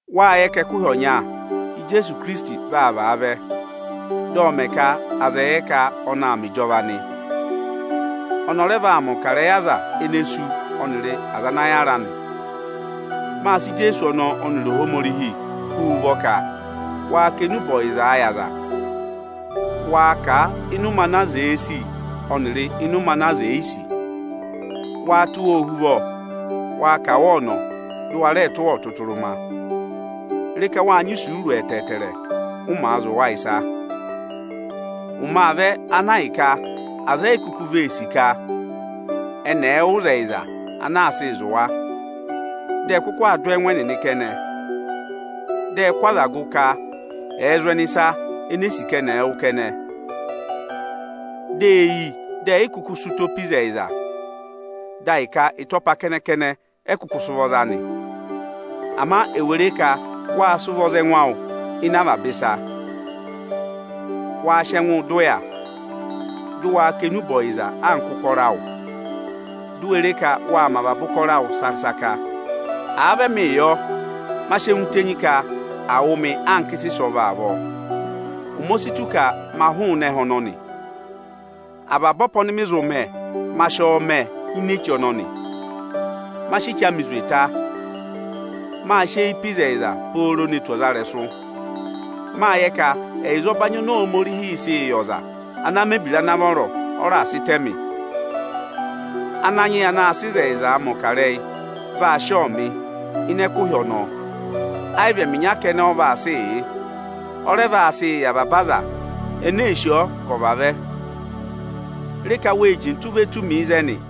Wáa yẹ ka ẹkụhị ọnya Ijeesu Ikirisiti vaa vaa vẹ, dị ọ mẹ ka aza ẹ̀ yẹ ka ọnị aa mẹ ịjọva nị. Ọnị ọ rẹ vaa mẹ̀ ọkarẹyị aza ene sú ọnịrị aza ana yára nị. Máa sị Ijeesu ọnọọ ọnịrị Ohomorihi hú wu ụvọ ka, waa kà enube ọyịzaa yị aza! Waa kà a ịnị ụmẹ ana aza èe sì ọnịrị ịnị ụmẹ ana aza è yi sì! Waa tụ́ wa ohuvọ, waa kà wa ọnọ, dụ wa rẹẹ tụ́ wa ọtụtụrụma! Re ka wáa nyị isuuru ẹtẹẹtẹrẹ, ụ màa zụ̀ wa ịsa! Ụmẹ aa vẹ ana ahịka aza eyi kuku vee sì ka ẹnị ẹ̀ẹ wụ́ ịzẹyịza ana aa sịị zụ̀ wa. Dị ẹ kụkụ aa dụ ẹ́ẹngụ ẹnịnị kẹnẹ. Dị ẹ kụ́ aza gụ ka ẹ̀ẹ zụ̀ ẹnị ịsa eni eè sì ka ẹnị ẹ̀ẹ wụ́ kẹnẹ. Dị e yi, dị ẹyị kụkụ sị ụtọ pe ịzẹyịza, dị ahịka ịtọpa kẹnẹ-kẹnẹ ẹ kụkụ sị ụvọ za nị. Ama ewè re ka wáa sị ụvọ za ẹngụ awụ ịnị avaba ịsa! Waa sị ẹngụụ dọ ụya, dị waa kà enube ọyịza anka ụkọrọ awụ! Di u we re ka waa mẹ avaba ụkọrọ awụ saka-saka! Àa vị ẹmịị yọ, ma sị ẹngụ tenyi ka à wụ̀ mị anka ịsa ịsọvọ avọọ. Ụmẹ o si tù ka ma hụụnị ẹhẹ ọnọnị. Avaba ọpa ọnị mị zụ mẹ, ma sị ọọ mẹ ini echi ọnọnị. Ma sị echi amị zwe ta. Mâ sị eyi pe ịzẹyịza pooro ne tù ọzarẹyịrẹsụ. Máa yẹ ka ẹyịza ọbanyị oni Ohomorihiī sịị yị ọza ana mẹ̀ ebira ana vọrọ, ọ raà sị tẹ mị. Ananyị yị anaā sịị ịzẹyịzaa mẹ̀ ọkarẹyị vaa sị ọọ mị ịnị ẹkụhị ọnọọ. Ayị vị ẹmị ịnya kẹnẹ ọ vaa sịị yị; ọ rẹ vaa sịị yị avaba aza ene ee sì ọọ ka ọ̀ vavẹ. Ịpọọrụ ộ kà ịrẹyị ẹngụ anị. Re ka wée jintu ve tù mi ịzẹnị.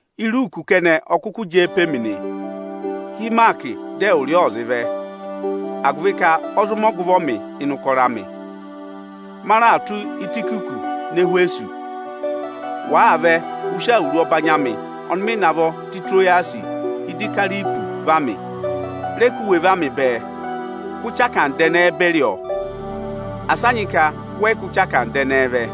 Iruuku kẹnẹ ọ kụkụ jẹẹ pe mi nị. Hị́ Ịmaakị dị ẹwụrị ọ ọ̀ zị vẹ! agụvị ka ọ zụ mẹ ọgụvọ mị ịnị ụkọrọ amị. Ma raà tụ́ Ịtayịkịkọsị nọ Ẹhwẹsọsị. Wàaa vẹ, ụ sị awuru ọbanyị amị ọnị mị navọ tụ́ Itirowasị yị Ikaripọsị va mị! Rẹ kụ́ iwe amị va mị bẹẹ! Kụ́ ẹnya ọchẹrịsa ẹnẹẹ beri ọọ. Asị a nyị ka wẹ yị kụ́ ẹnya ọchẹrịsa ẹnẹẹ vẹ.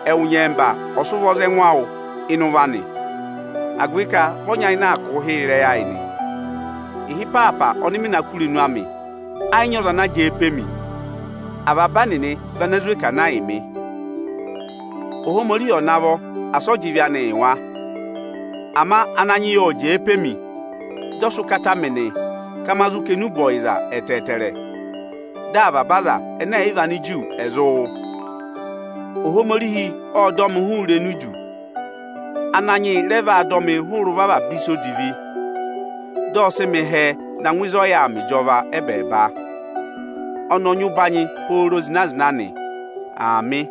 Ẹwụ nyẹmba ọ̀ sị ụvọ za ẹngụ awụ ịnị ụvọ anị, agụvị ka vị ọ nyayịnẹ aa kụ̀ụ hịrẹ ịrẹyị ayị nị. Ịhị ịpaapa ọnị mị na kụ́ irenu amị, ẹ yị nyị ọza ana jẹẹ pe mi. Avaba ẹnịnị vị ene zwe kà na yị mị. Ohomorihi ọ̀ navọ asị ọ jị ịvị anị yị wa! Ama Ananyị yị ộ jẹẹ pe mi, dị ọ sị ụkata mị ka ma zụ kà enube ọyịza ẹtẹẹtẹrẹ, dị avaba aza ẹnẹ ẹ̀ yị vị Aniju ẹ̀ zụ wụ́ nị. Ohomorihi ộ dọ mị hụrị irenu idu. Ananyị yị rẹ vaa dọ mịị hụrẹ ụvọ avaba ịsa odivi, dị ọ sị mị hẹẹ na ngụ ịzị ọ yà aa mẹ ịjọva ẹ́bẹẹba. Ọnị ọ nyị ụbanyị pooro zịna-zịna nị. Aamị.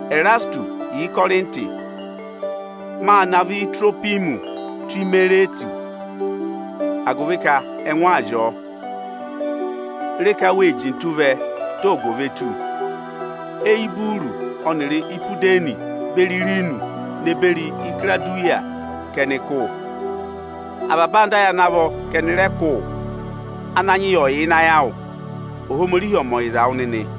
Ẹrasịtụsị yà Ịkọrịntị, mâ navọ Itirohwimọsị tụ́ Imiretụsị agụvị ka ẹngụ aa zị ọọ. Re ka wée jintu vẹ, dị ọgụ ò ve tù. Eyuburusi ọnịrị Ipudeni beri Ịranọsị ne beri Ikirawudiya ka ẹnị kụ́ wụ. Avaba anda ayị ana vọ ka ẹnị rẹ kụ́ wụ. Ananyị yị ọ̀ yà ịnị ayị awụ! Ohomorihi ọ̀ mẹ ọyịza wụ nịnị!